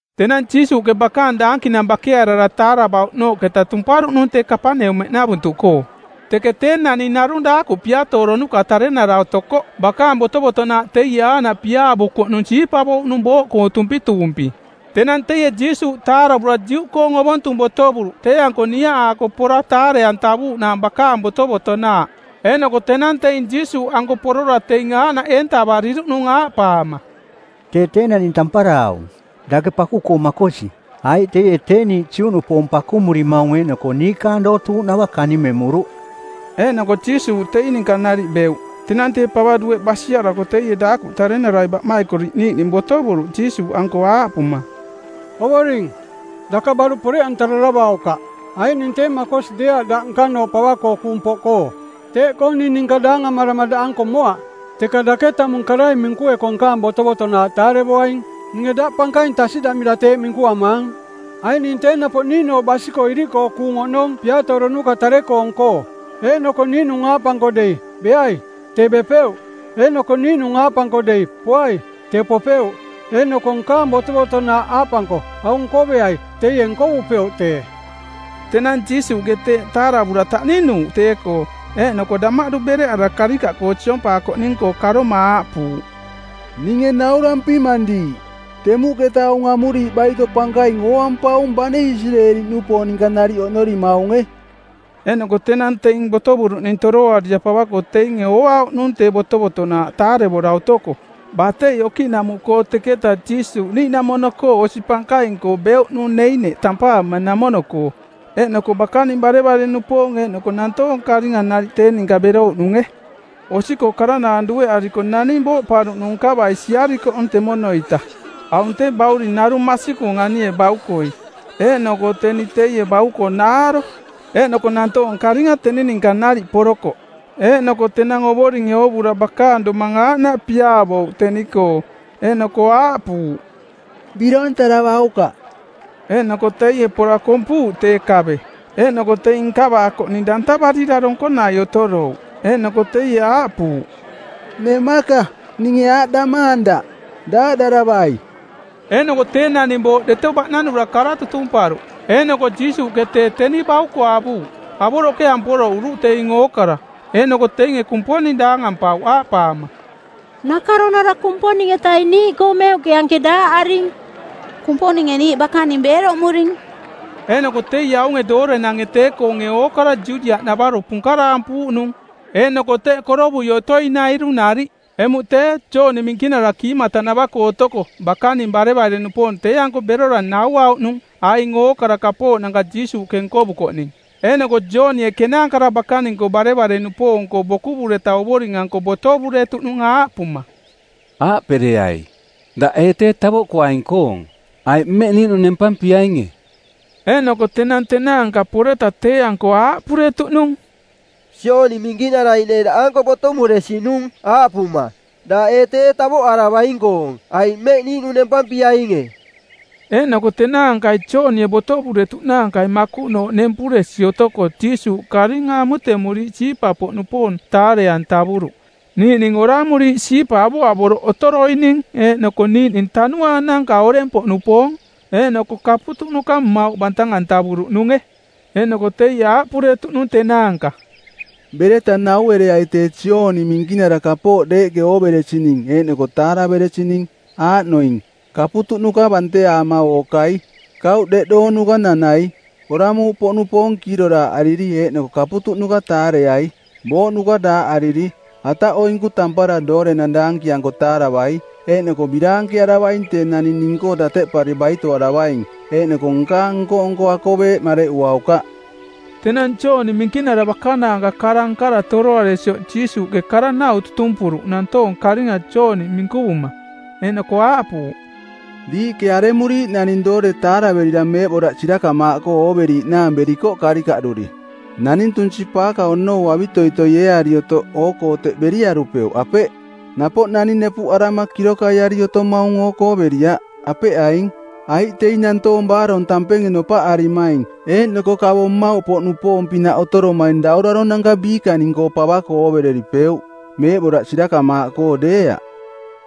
Tenang Jiisuuꞌke bakaang daankinang bakearara taaravauꞌnooꞌketa tumparuꞌnung tee Kapaneumeꞌnavuntuꞌkoo. Teke tee naning narung daakuꞌ piatooronuka tarenara otokoꞌ bakaang botovotonaaꞌ teie aaꞌnaꞌ piaavukoꞌnung siipavouꞌnung booꞌkoo tumpituumpi. Tenang teie Jiisuuꞌ taaravura Juꞌkoong Ovontung botovuruꞌ tee-anko niaꞌaako pora taare-antavuuꞌnaang bakaang botovotonaaꞌ. Eeꞌnoko tenang teing Jiisuuꞌanko porora teing aaꞌnaꞌ eentavariruꞌnung aaꞌpaama, “Tee tee naning tampara aung, dake paku-koo makosi, aiꞌ teie tee niiꞌ Juꞌnupoong pakumurimaung eeꞌnoko niikaang dootuuꞌnava kanimemuruꞌ.” Eeꞌnoko Jiisuuꞌ teing ninka nariꞌ beuꞌ. Tenang tee pava dueꞌ basiarako teie daakuꞌ tarenarai baꞌmaikoriꞌ niiꞌning botovuruꞌ Jiisuuꞌanko aaꞌpuma, “Ovoring, daka baruꞌ poreꞌantararavaukaꞌ, aiꞌ ning tee makosi deeaꞌ daꞌ nkanooꞌ pava-koo kuung poꞌkoo. Teeꞌkoo ning ninka daangamarama daꞌanko moaꞌ, teka dake tamung karai minkueko nkaang botovotonaaꞌ taarevoaing. Ninge daꞌ pankaing tasiꞌdamira teeꞌ minkuamaang, aiꞌ ning tee napoꞌ niiꞌnooꞌ basi-koo iriꞌkoo kuung oꞌnong piatooronuka tare-koong-koo. Eeꞌnoko niiꞌnung aaꞌpanko dei, ‘Beai,’ tee bepeuꞌ. Eeꞌnoko niiꞌnung aaꞌpanko dei, ‘Poai,’ tee popeuꞌ. Eeꞌnoko nkaang botovotonaaꞌ aaꞌpanko, ‘Aung nkoveai,’ teie nkovupeuꞌ tee.” Tenang Jiisuuꞌke teeꞌ taaravura taꞌninuuꞌ tee-koo, eeꞌnoko damaꞌdu bereꞌarara karikaꞌkoo siompaakoꞌning-koo karoma aaꞌpuuꞌ, “Ninge naurampimang diiꞌ: temuꞌketa aung amuriiꞌ baito pankaing ooampaung bane Isireeli-nupoong ninka nariꞌ oꞌnorimaunge.” Eeꞌnoko tenang teing botovuruꞌning toroarira pava-koo teinge ooauꞌnung tee botovotonaaꞌ taarevora otoko. Batei okiꞌnamuꞌkoo teketaꞌ Jiisuuꞌ niiꞌnamono-koo osi pankaing-koo beuꞌnung Neiniꞌ tampaamanamono-koo. Eeꞌnoko bakaning barevare-nupoong eeꞌnoko nantoong karinga nariꞌ tee ninka berouꞌnunge. Osi-koo karanaang dueꞌarako naning booꞌparuꞌnung nkavai siarikoꞌ temono-ita. Aung tee bauring narung masikung anie baukoi, eeꞌnoko teni teie bauko naaro. Eeꞌnoko nantoong karinga teni ninka nariꞌ porokoꞌ. Eeꞌnoko tenang Ovoringe oovura bakaang domang aaꞌnaꞌ piaavouꞌ teni-koo, eeꞌnoko aaꞌpuuꞌ, “Birontaravaukaꞌ.” Eeꞌnoko teie pora kompuuꞌ tee kave, eeꞌnoko teing nkavaakoꞌning dantavarira donkonai otorouꞌ. Eeꞌnoko teie aaꞌpuuꞌ, “Nemaka, ninge aaꞌdamaang daꞌ, ‘Daaꞌdaravai.’” Eeꞌnoko tee naning booꞌ deto baꞌnanura kara tutumparuꞌ, eeꞌnoko Jiisuuꞌke tee teni bauko avuuꞌ. Avoroꞌke amporoꞌuruꞌ teing ookara. Eeꞌnoko teinge Kumponing daangampauꞌ aaꞌpaama, “Nakaronara Kumponing-etaing niiꞌkoo meuꞌke anke daaꞌaring; Kumponinge niiꞌ bakaning beeroꞌmuring!” Eeꞌnoko teie aunge doorenange tee-koonge ookara Judiaꞌnavaro punkaraampuuꞌnung eeꞌnoko teꞌ korovui otoinairu nariꞌ. Emuꞌ tee, Jooni Minkinara kiimatanava-koo otoko bakaning barevare-nupoong tee-anko berora nauauꞌnung aing ookara kapooꞌnanka Jiisuuꞌke nkovukoꞌning. Eeꞌnoko Joonie kenaankara bakaning-koo barevare-nupoong-koo bokuvureta Ovoring-anko botovuretuꞌnung aaꞌpuma, “Aaꞌpereai, ‘Daꞌ ee tee tavoꞌkuaing-koong, aiꞌ mmeꞌ niiꞌnung nempampiainge?’” Eeꞌnoko tenang tenaanka poreta tee-anko aaꞌpuretuꞌnung, “Jooni Minkinarai neeꞌ daꞌanko botomuresinung aaꞌpuma: ‘Daꞌ ee tee tavoꞌaravaing-koong, aiꞌ mmeꞌ niiꞌnung nempampiainge?’” Eeꞌnoko tenaankai Joonie botovuretuꞌnaankai makuꞌnooꞌ nempuresi otoko Jiisuuꞌke karinga amutemuriiꞌ siipa-poꞌnupoong taare-antavuruꞌ, niiꞌning oramuriiꞌ siipa avoꞌavoroꞌ otoroining eeꞌnoko niiꞌning tanuaananka oreng-poꞌnupoong. Eeꞌnoko kaputuꞌnuka mmauꞌ bantang-antavuruꞌnunge. Eeꞌnoko teie aaꞌpuretuꞌnung tenaanka, “Bereta nauereai tee Jooni Minkinara kapooꞌ deeꞌke ooveresining eeꞌnoko taaraveresining, aaꞌnoining: kaputuꞌnuka banteaama ookai, kauꞌ deꞌdoonuka nanai, oramuuꞌpoꞌnupoong kiiroraaꞌariri eeꞌnoko kipaunuka taareai, booꞌnuka daaꞌariri, ataꞌoinku tampara doorenang daankianko taaravai. Eeꞌnoko biraankearavaing tee naning ning-koo dateꞌpari baitoaravaing, eeꞌnoko nkaang nko-nko akoveeꞌ mareꞌuaukaꞌ.” Tenang Jooni Minkinara bakanaanka kara nkara toroaresioꞌ Jiisuuꞌke kara-nau tutumpuruꞌ nantoong karinga Jooni minkuvuma; eeꞌnoko aaꞌpuuꞌ, “Diiꞌke aremuriiꞌ naning doore taaraverira meeꞌboraꞌ sirakamaaꞌkoo ooveriiꞌnaang berikoꞌ karikaꞌduri? Naning tunsi-paaka onou avitoitoi eeari otoꞌ oo-koo teꞌ beriarupeuꞌ, apeꞌ? Napoꞌ naning nepuꞌarama kirokaiari otomaung oo-koo beriaꞌ, apeꞌ aing? Aiꞌ teing nantoong baarong tampenge nopaꞌarimaing, eeꞌnoko kavo mmauꞌpoꞌnupoong-pinaꞌ otoromaing dauraronanka biikaning-koo pava-koo oovereripeuꞌ, meeꞌboraꞌ sirakamaaꞌkoo deeaꞌ.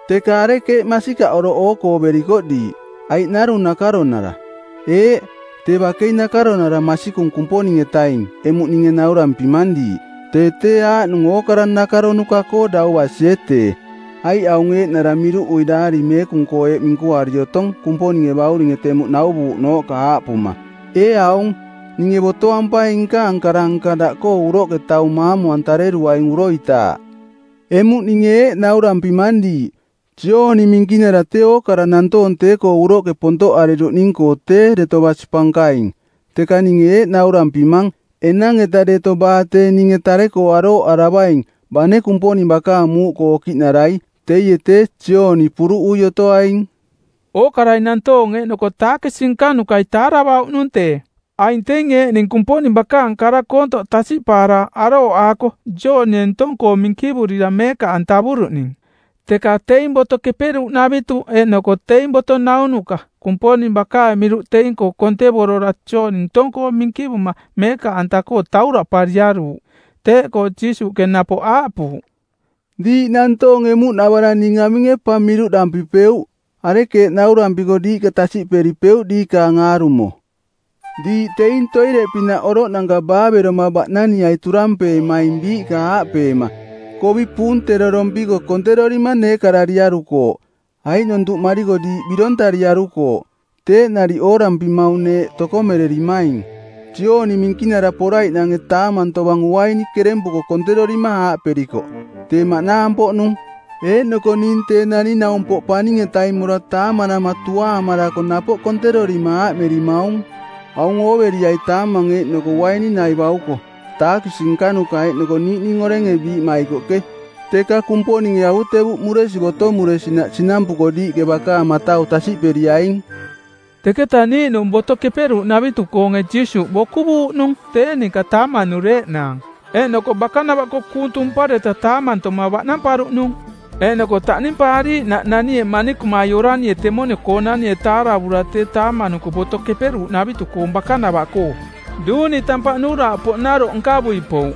Teka arekeeꞌ masikaꞌ oroꞌ oo-koo berikoꞌ diiꞌ, aiꞌ narung nakaronara? Eeꞌ, tee bakei nakaronara masikung Kumponing-etaing emuꞌ ninge naurampimang diiꞌ, tee tee aaꞌnung ookara nakaronuka-koo dau basie tee. Aiꞌ aung eeꞌnara miruꞌui Daari Meekung-koo eeꞌ minkuari otong Kumponinge bauring temuꞌ nauvuuꞌnooꞌka aaꞌpuma, ‘Ee aung, ninge botoampaing nkaang kara-nka daꞌkoo uroꞌke tee taung maamu-antareruaing uroitaaꞌ.’ Emuꞌ ninge aaꞌdampimang diiꞌ, Jooni Minkinara tee ookara nantoong tee-koo uroꞌke pontoꞌariruꞌning-koo tee deto basi pankaing, teka ninge eeꞌ naurampimang, enang-eta deto baa tee ninge tare-koo arooꞌaravaing, bane Kumponing bakaang muuꞌkoo okiꞌnarai, teie tee Jooni puruꞌui otoaing.” Ookarai nantoonge eeꞌnoko taakisi nkanukai taaravauꞌnung tee. Aing teing eeꞌning Kumponing bakaang kara koontoꞌ tasiꞌpaara arooꞌaako Joonie ntong-koo minkivurira meekaꞌantavuruꞌning. Teka teing Boto Keperuuꞌnavitu eeꞌnoko teing boto naunuka Kumponing bakaang miruꞌ teing-koo kontevorora Joonie ntong-koo minkivuma meekaꞌanta-koo tauraꞌpariaruuꞌ. Teeꞌkoo Jiisuuꞌke napoꞌ aaꞌpuuꞌ, “Diiꞌ nantoong emuꞌnavarang ninge aminge pa miruꞌdampipeuꞌ? Arekeeꞌ naurampiko diiꞌka tasiꞌdaripeuꞌ diikaang aarumo? Diiꞌ teing toireꞌpinaꞌ oroꞌnanka baaveroma baꞌnaniai turampeemaing biiꞌka aaꞌpeema, ‘Kovi puunterorompiko konterorima neekarariarukooꞌ. Aiꞌnontuꞌmariko diiꞌ birontariarukooꞌ.’ Teeꞌ nariꞌ oorampimaung neeꞌ tokomererimaing. Jooni Minkinara poraiꞌnange taamang tovang uaini kerempuko konterorima aaꞌperikoꞌ, ‘Tee maꞌnaang-poꞌnung.’ Eeꞌnoko ning Tee Naning-naumpoꞌ Paning-etaing mora taamanama tuaamarako napoꞌ konterorima aaꞌmerimaung, ‘Aung ooveriai taamang eeꞌnoko uaini nai bauko, taakisi nkanuka eeꞌnoko niiꞌning orenge biiꞌmaikoꞌke.’ Teka Kumponinge avutevuꞌmuresi botomuresinaꞌ sinampuko diiꞌke bakaang matau tasiꞌperiaing.” Teketaꞌ niiꞌnunge Boto Keperuuꞌnavitu-koonge Jiisuuꞌ bokuvuuꞌnung tee ninka taamanureeꞌnaang, eeꞌnoko bakanava-koo kuung tumpareta taamantoma baꞌnamparuꞌnung. Eeꞌnoko taꞌnimpaariiꞌnaꞌ nanie manikumai oranie temono-koonanie taaravura tee taamanuko Boto Keperuuꞌnavitu-koong bakanava-koo, duuni tampaꞌ nuuraaꞌpoꞌnaroꞌ nkavui pouꞌ.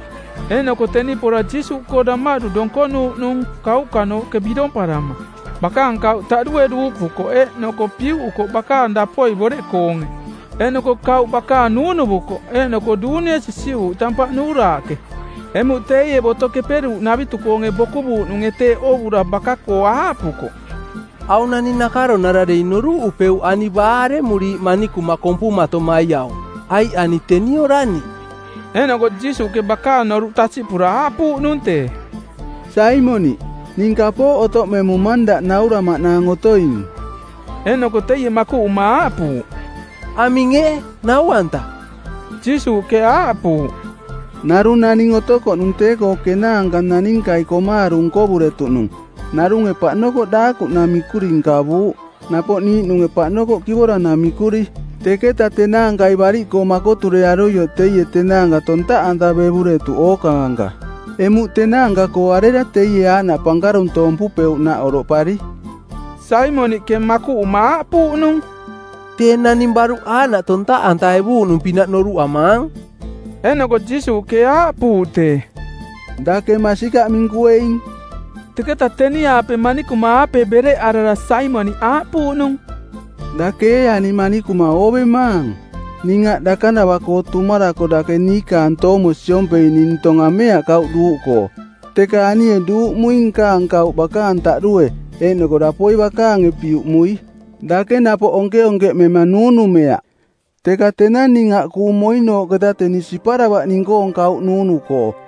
Eeꞌnoko teni pora Jiisuuꞌkoo damaꞌdu donkonuuꞌnung kauꞌkanooꞌke biromparama. Bakaang kauꞌ taꞌdue duuꞌpukoꞌ eeꞌnoko piuꞌukoꞌ bakaang dapoi boreꞌkoonge, eeꞌnoko kauꞌ bakaang nuunuvukoꞌ eeꞌnoko duunie sisiꞌuuꞌ tampaꞌ nuuraaꞌke. Emuꞌ teie Boto Keperuuꞌnavitu-koonge bokuvuuꞌnunge tee oovura baka-koo aaꞌpukoꞌ, “Aung naning nakaronara dei noruꞌupeuꞌ ani baa aremuriiꞌ manikuma kompumatomai aung, aiꞌ ani teni orani.” Eeꞌnoko Jiisuuꞌke bakaang noruꞌ tasiꞌpura aaꞌpuuꞌnung tee, “Saimoniꞌ, ning kapooꞌ otoꞌmemumang daꞌ nauramaꞌnaang otoing.” Eeꞌnoko teie makuꞌuma aaꞌpuuꞌ, “Aming ee, nau-anta?” Jiisuuꞌke aaꞌpuuꞌ, “Narung naning otokoꞌnung tee-koo kenaanka naninkai komaaru nkovuretuꞌnung. Narunge paꞌnokoꞌ daakuꞌ namikuri nkavuuꞌ, napoꞌ niiꞌnunge paꞌnokoꞌ kivora namikuri. Teketa tenaankai bariꞌkoo makoturearuioꞌ teie tenaanka tontaꞌantavevuretuꞌ ookaanka. Emuꞌ tenaanka-koo arera teie aaꞌnaꞌ pankaruntoompupeuꞌnaꞌ oroꞌpari?” Saimoniꞌke makuꞌuma aaꞌpuuꞌnung, “Tee naning baruꞌ aaꞌnaꞌ tontaꞌantaevuuꞌnung-pinaꞌ noruꞌamaang.” Eeꞌnoko Jiisuuꞌke aaꞌpuuꞌ tee, “Dake masikaꞌ minkueing.” Teketaꞌ teni-aape manikuma-aape bereꞌarara Saimoniꞌ aaꞌpuuꞌnung, “Dake ee ani manikuma oovemaang? Ning aꞌ dakanava-koo tumarako dake niikaang toomo siompei ning ntong ameaꞌ kauꞌ duuꞌkoo, teka anie duuꞌmuing nkaang kauꞌ bakaang taꞌdue eeꞌnoko dapoi bakaange piuꞌmui. Dake napoꞌ onkeonkeꞌmema nuunumeaꞌ, teka tenang ning aꞌ kuung moinooꞌketaꞌ teni siparavaꞌ ning-koong kauꞌ nuunu-koo.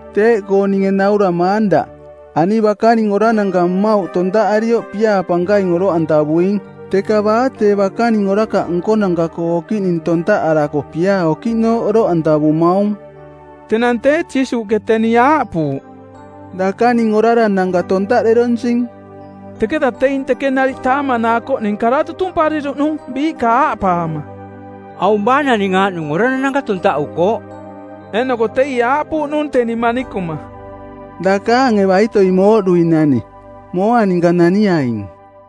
Teeꞌkoo ninge nauramaang daꞌ: Ani bakaning orarananka mmauꞌ tontaꞌarioꞌ piaa pankaing oroꞌantavuing, teka baa tee bakaning orakaꞌ nkonanka-koo okiꞌning tontaꞌarako piaa okiꞌnooꞌ oroꞌantavumaung.” Tenang tee Jiisuuꞌke teni aaꞌpuuꞌ, “Dakaning orarananka tontaꞌderonsing.” Teketa teing teke nariꞌ taamanaakoꞌning kara tutumpariruꞌ nung biiꞌka aaꞌpaama, “Aung baa naning aaꞌnung orarananka tontaꞌukooꞌ?” Eeꞌnoko teie aaꞌpuuꞌnung teni manikuma, “Dakaange baitoi mooꞌduinani. Mooa ninka naniaing.”